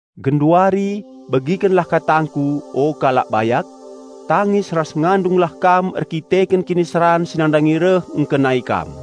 Genduari, begikenlah katangku, o kalak bayak! Tangis ras ngandunglah kam erdandanken kiniseran si nandangi reh ngkenai kam!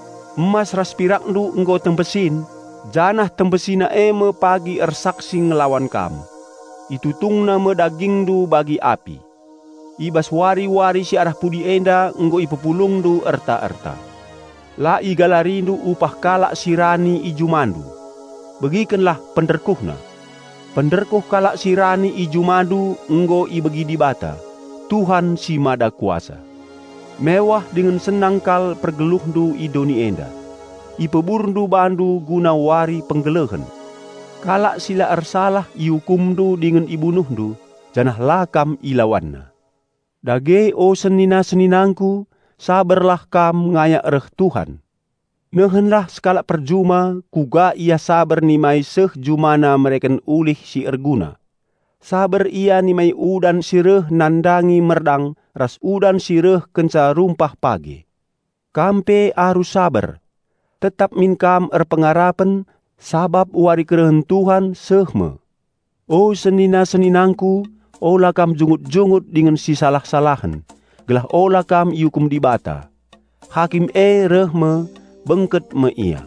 Emas ras pirakndu nggo tembesin, janah tembesina e me pagi ersaksi ngelawan kam. Itutungna me dagingndu bagi api. I bas wari-wari si arah pudi enda nggo ipepulungndu erta-erta. La igalarindu upah kalak si rani i jumandu. Begikenlah penderkuhna! Penderkuh kalak si rani i jumandu nggo ibegi Dibata, Tuhan si Mada Kuasa. Mewah dingen senang kal pergeluhndu i doni enda. Ipeburndu bandu guna wari penggelehen. Kalak si la ersalah iukumndu dingen ibunuhndu, janah la kam ilawanna. Dage o senina-seninangku, saberlah kam ngayak reh Tuhan. Nehenlah sekalak perjuma kuga ia saber nimai seh jumana mereken ulih si erguna. Saber ia nimai udan si reh nandangi merdang ras udan si reh kenca rumpah page. Kam pe arus saber. Tetap min kam erpengarapen, sabap wari kerehen Tuhan seh me. O senina-seninangku, ula kam jungut-jungut dingen sisalah-salahen, gelah ula kam iukum Dibata. Hakim e reh me; bengket me Ia.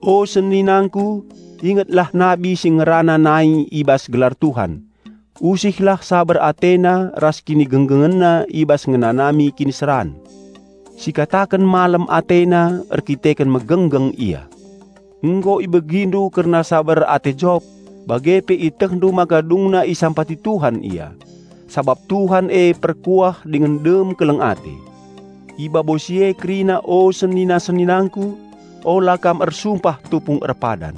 O seninangku, ingetlah nabi si ngerana nai i bas gelar Tuhan. Usihlah saber atena ras kinigenggengenna i bas ngenanami kiniseran. Sikataken malem atena erkiteken megenggeng ia. Nggo ibegindu kerna saber ate Jop, bage pe ietehndu maka dungna isampati Tuhan ia. Sabap Tuhan e perkuah dingen dem keleng ate. I babo si e kerina o senina-seninangku, ula kam ersumpah tupung erpadan.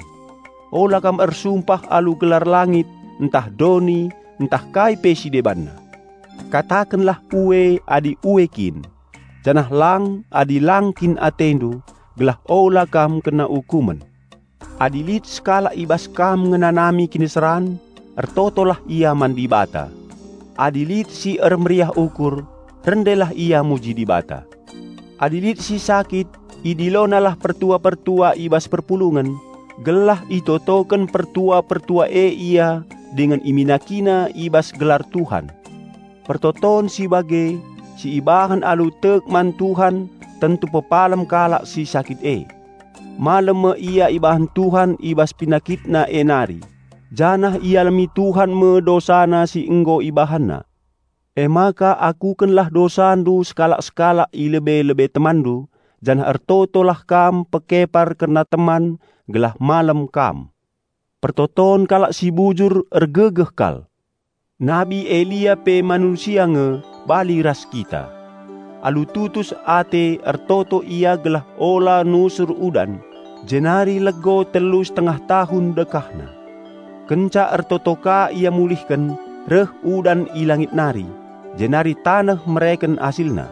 Ula kam ersumpah alu gelar langit, ntah doni, ntah kai pe si debanna. Katakenlah "Ue" adi ue kin, janah "Lang" adi lang kin atendu, gelah ula kam kena ukumen. Adi lit sekalak i bas kam ngenanami kiniseran, ertotolah ia man Dibata. Adi lit si ermeriah ukur, rendelah ia muji Dibata. Adi lit si sakit, idilonalah pertua-pertua i bas perpulungen, gelah itotoken pertua-pertua e ia dingen iminakina i bas gelar Tuhan. Pertoton si bage, si ibahan alu tek man Tuhan tentu pepalem kalak si sakit e. Malem me ia ibahan Tuhan i bas penakitna e nari, janah ialemi Tuhan me dosana si nggo ibahanna. Emaka akukenlah dosandu sekalak-sekalak i lebe-lebe temanndu, janah ertotolah kam pekepar kerna teman, gelah malem kam. Pertoton kalak si bujur ergegeh kal. Nabi Elia pe manusia nge bali ras kita. Alu tutus ate ertoto ia gelah ula nusur udan, jenari lego telu setengah tahun dekahna. Kenca ertoto ka ia mulihken, reh udan i langit nari, jenari taneh mereken asilna.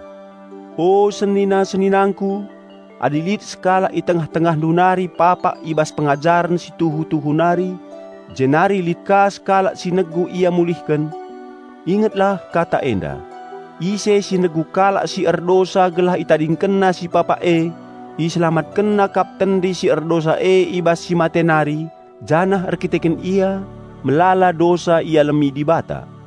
O senina-seninangku! Adi lit sekalak i tengah-tengahndu nari papak i bas pengajaren si tuhu-tuhu nari, jenari lit ka sekalak si negu ia mulihken, ingetlah kata enda: Ise si negu kalak si erdosa gelah itadingkenna si papak e, iselamatkenna kap tendi si erdosa e i bas si mate nari, janah erdandanken ia, melala dosa ialemi Dibata.